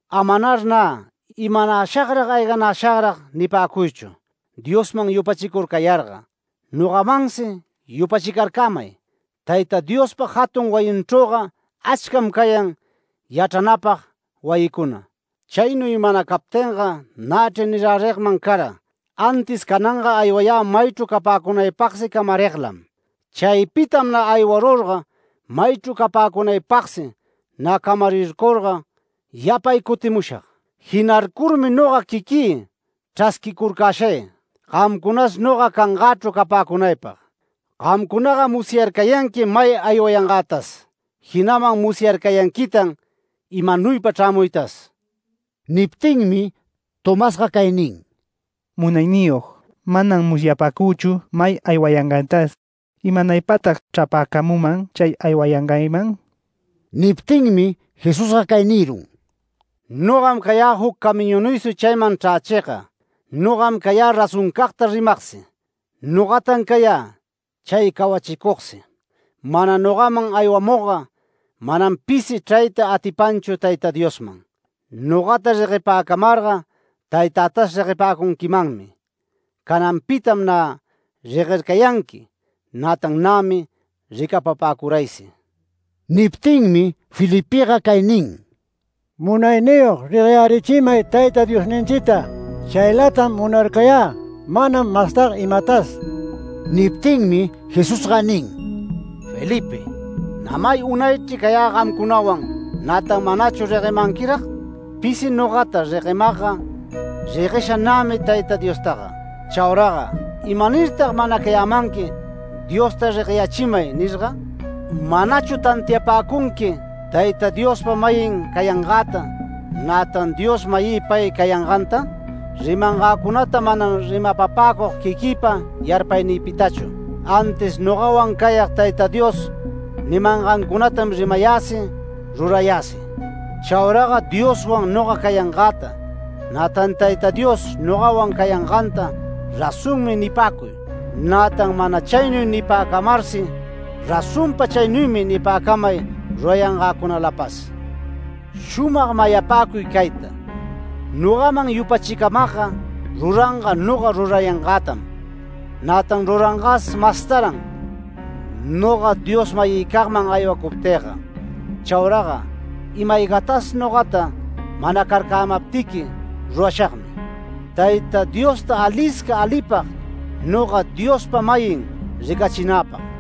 “Amar nä, ‘¿Imanashagrag ayganashagrag?’ nipäcuychu. Diosman yupachicurcayarga, nogamansi yupachicarcämay. Tayta Diospa jatun wayinchrüga achcam cayan yachranapag wayicuna. Chaynuy mana captinga nächri nirärigman cara, antis cananga aywayä maychru capäcunaypagsi camariglam. Chaypitam nä aywarurga maychru capäcunaypagsi nä camarircurga yapay cutimushag. Jinarcurmi noga quiquï chrasquicurcäshay gamcunas noga cangächru capäcunaypag. Gamcunaga musyarcayanquim may aywayangätas, jinaman musyarcayanquitan imanuypa chrämuytas”. Niptinmi Tomasga cay nin: “Munayniyog, manam musyapäcüchu may aywayangaytas. ¿Imanaypatag chrapäcamüman chay aywayangayman?” Niptinmi Jesusga cay nirun: “Nogam cayä juc camiñunuysi chayman chrächigga, nogam cayä razoncagta rimagsi, nogatan cayä chay cawachicugsi. Mana nogaman aywamugga, manam pisi chrayta atipanchu Tayta Diosman. Nogata reguepäcamarga Taytätas reguepäcunquimanmi. Cananpitam nä reguercayanqui, nätan nämi ricapapäcuraysi”. Niptinmi Felipega cay nin: “Munayniyog, regueyärichimay Tayta Diosninchita. Chaylatam munarcayä manam mastaga imatas”. Niptinmi Jesusga nin: “Felipe, ¿nä may unaychri cayä gamcunawan, nätan manachu reguemanquirag? Pisi nogata reguemagga, reguesha nämi Tayta Diostaga. Chauraga ¿imanirtag manacayamanqui: ‘Diosta regueyärichimay’ nirga? ¿Manachu tantiapäcunqui Tayta Diospa-mayin cayangäta, nätan Dios-mayï pay cayanganta? Rimangäcunata manam rimapapäcug quiquïpa yarpaynïpitachu, antis nogawan cayag Tayta Dios nimangancunatam rimayäsi, rurayäsi. Chauraga Dioswan noga cayangäta, nätan Tayta Dios nogawan cayanganta razonmi nipäcuy, nätan mana chaynuy nipäcamarsi razonpa chaynuymi nipäcamay rurayangäcunalapas. Shumag mayapäcuy cayta: Nogaman yupachicamagga ruranga noga rurayangätam, nätan rurangas mastaran noga Dios-mayïcagman aywacuptïga. Chauraga ima-aygatas nogata manacarcamaptiqui rurashagmi, Tayta Diosta alisca alipag noga Diospa-mayin ricachinäpag.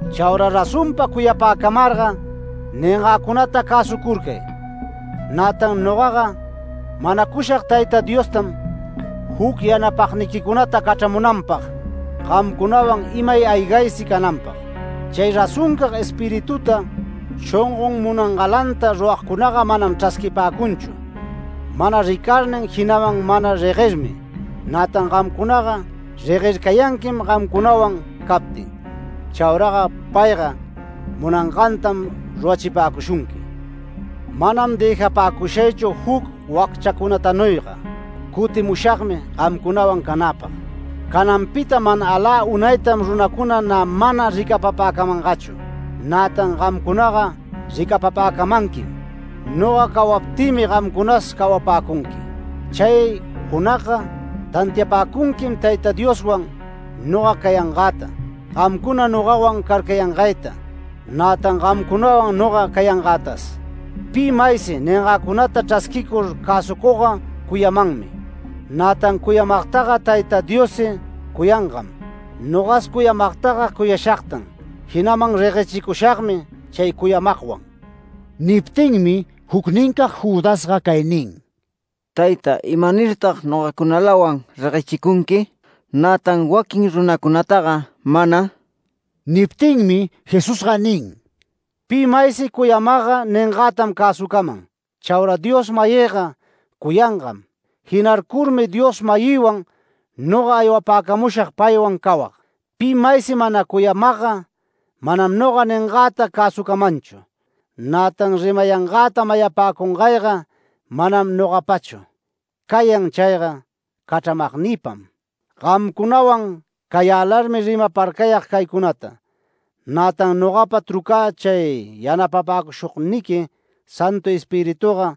“Chaura razonpa cuyapäcamarga ningäcunata cäsucurcay. Nätan nogaga manacushag Tayta Diostam juc yanapagniquicunata cachramunanpag, gamcunawan imay aygaysi cananpag. Chay razoncag Espirituta, shongon munangalanta ruragcunaga manam chrasquipäcunchu, mana ricarnin, jinaman mana reguermi. Nätan gamcunaga reguercayanquim gamcunawan captin. Chauraga payga munangantam rurachipäcushunqui. Manam dëjapäcushaychu juc wacchacunatanuyga. Cutimushagmi gamcunawan canäpag. Cananpita mana alä unaytam runacuna nä mana ricapapäcamangachu, nätan gamcunaga ricapapäcamanquim. Noga cawaptïmi gamcunas cawapäcunqui. Chay junagga tantiapäcunquim Tayta Dioswan noga cayangäta, gamcuna nogawan carcayangayta, nätan gamcunawan noga cayangätas. Pi maysi ningäcunata chrasquicur cäsucugga cuyamanmi. Nätan cuyamagtaga Tayta Diossi cuyangam. Nogas cuyamagtaga cuyashagtan, jinaman reguechicushagmi chay cuyamagwan”. Niptinmi jucnincag Judasga cay nin: “Tayta, ¿imanirtag nogacunalawan reguechicunqui, nätan waquin runacunataga mana?” Niptinmi Jesusga nin: “Pi maysi cuyamagga ningätam cäsucaman. Chaura Dios-mayïga cuyangam. Jinarcurmi Dios-mayïwan noga aywapäcamushag paywan cawag. Pi maysi mana cuyamagga, manam noga ningäta cäsucamanchu. Nätan rimayangäta mayapäcungayga manam nogapachu, cayan chayga cachramagnïpam. Gamcunawan cayälarmi rimaparcayag caycunata. Nätan nogapa trucä chay yanapapäcushugniqui Santu Espirituga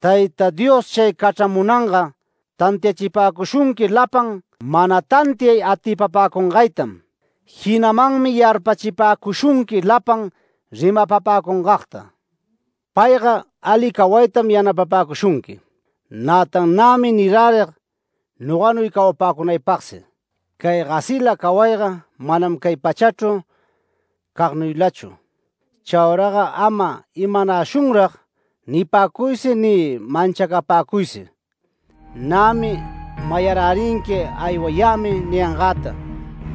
Tayta Dios chay cachramunanga tantiachipäcushunqui lapan mana tantiay atipapäcungaytam. Jinamanmi yarpachipäcushunqui lapan rimapapäcungagta. Payga ali cawaytam yanapapäcushunqui. Nätan nämi nirärig noganuy cawapäcunaypagsi. Cay gasila cawayga manam cay pachachru cagnuylachu. Chauraga ama ‘¿Imanashunrag?’ nipäcuysi ni manchacapäcuysi. Nämi mayarärinqui aywayämi ningäta,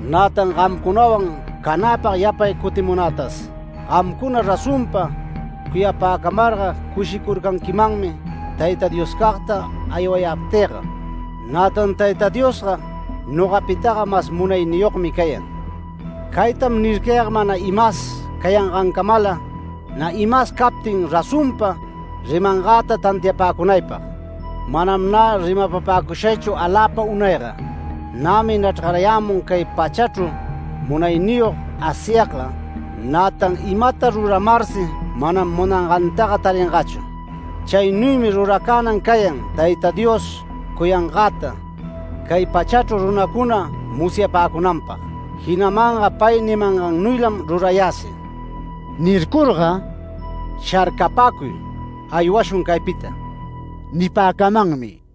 nätan gamcunawan canäpag yapay cutimunätas. Gamcuna razonpa cuyapäcamarga cushicurcanquimanmi Tayta Dioscagta aywayaptïga. Nätan Tayta Diosga nogapitaga mas munayniyogmi cayan. Cayta nircayag mana imas cayangancamalam nä imas captin razonpa rimangäta tantiapäcunaypag. Manam nä rimapapäcushaychu aläpa unayga. Nämi nachrgayämun cay pachachru munayniyog Asyagga, nätan imata ruramarsi manam munangantaga taringachu. Chaynuymi ruracänan cayan Tayta Dios cuyangäta, cay pachachru runacuna musyapäcunanpag, jinamanga pay nimangannuylam rurayäsi” nircurga, “Sharcapäcuy aywashun caypita” nipäcamanmi.